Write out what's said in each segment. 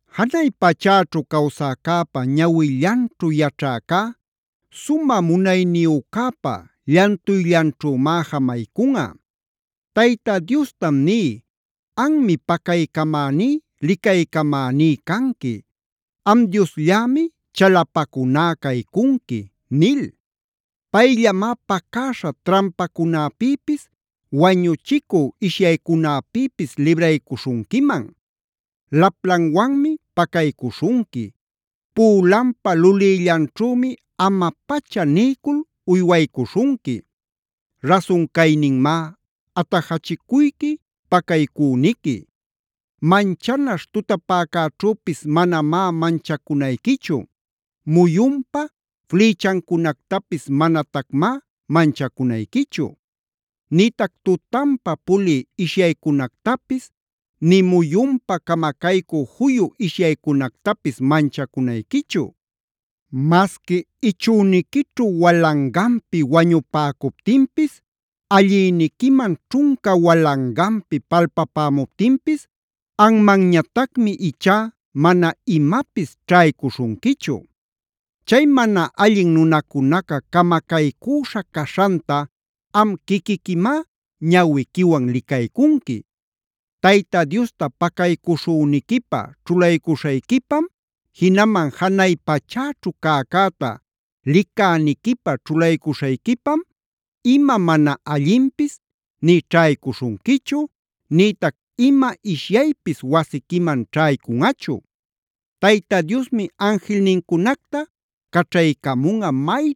Janay pachäćhu cawsäcäpa ñawillanćhu yaćhäcá, sumä munayniyücäpa llantuyllanćhümá jamaycunꞌa. Tayta Diostam ní: “Anmi pacaycamäní, licaycamäní canqui. Am Diosllämi chalapacuná caycunqui” nil. Payllamá pacäśha trampacunapïpis, wañuchicü ishyaycunapïpis libraycuśhunquiman. Laplanwanmi pacaycuśhunqui, pülanpa lulïllanćhümi ama-pacha niycul uywaycuśhunqui.a Rasun cayninmá atajachicuyqui, pacaycüniqui. Manchanaśh tutapäcäćhüpis manamá manchacunayquichu. Muyunpa flïchancunactapis manatacmá manchacunayquichu. Nïtac tutanpa pulï ishyaycunactapis, nï muyunpa camacaycü juyu ishyaycunactapis manchacunayquichu. Masqui ichüniquićhu walanganpi wañupäcuptinpis, allïniquiman ćhunca walanganpi palpapämuptinpis, anmanñatacmi ichá mana imapis ćhaycuśhunquichu. Chay mana allin nunacunaca camacaycüśha caśhanta am quiquiquimá ñawiquiwan licaycunqui. Tayta Diosta pacaycuśhüniquipä ćhulaycuśhayquipam, jinaman janay pachäćhu cäcäta licäniquipä ćhulaycuśhayquipam, ima mana allinpis nï ćhaycuśhunquichu, nïtac ima ishyaypis wasiquiman ćhaycunꞌachu. Tayta Diosmi anjilnincunacta caćhaycamunꞌa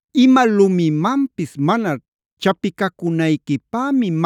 Ima lumimanpis mana chapicacunayquipämi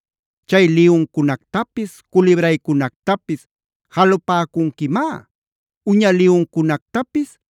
Chay liyuncunactapis, culibraycunactapis jalupäcunquimá. Uña liyuncunactapis,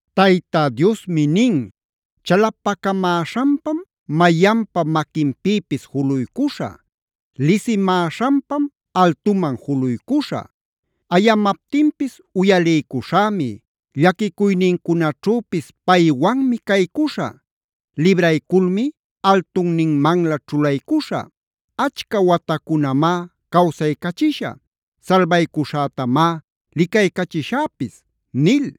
Tayta Diosmi nin: “Chalapacamäśhanpam mayanpa maquinpïpis juluycuśhä. Lisimäśhanpam altuman juluycuśhä. Ayamaptinpis uyaliycuśhämi; llaquicuynincunaćhüpis paywanmi caycuśhä. Librayculmi altunninmanlä ćhulaycuśhä. Achca watacunamá cawsaycachishä. Salbaycuśhätamá licaycachishäpis” nil.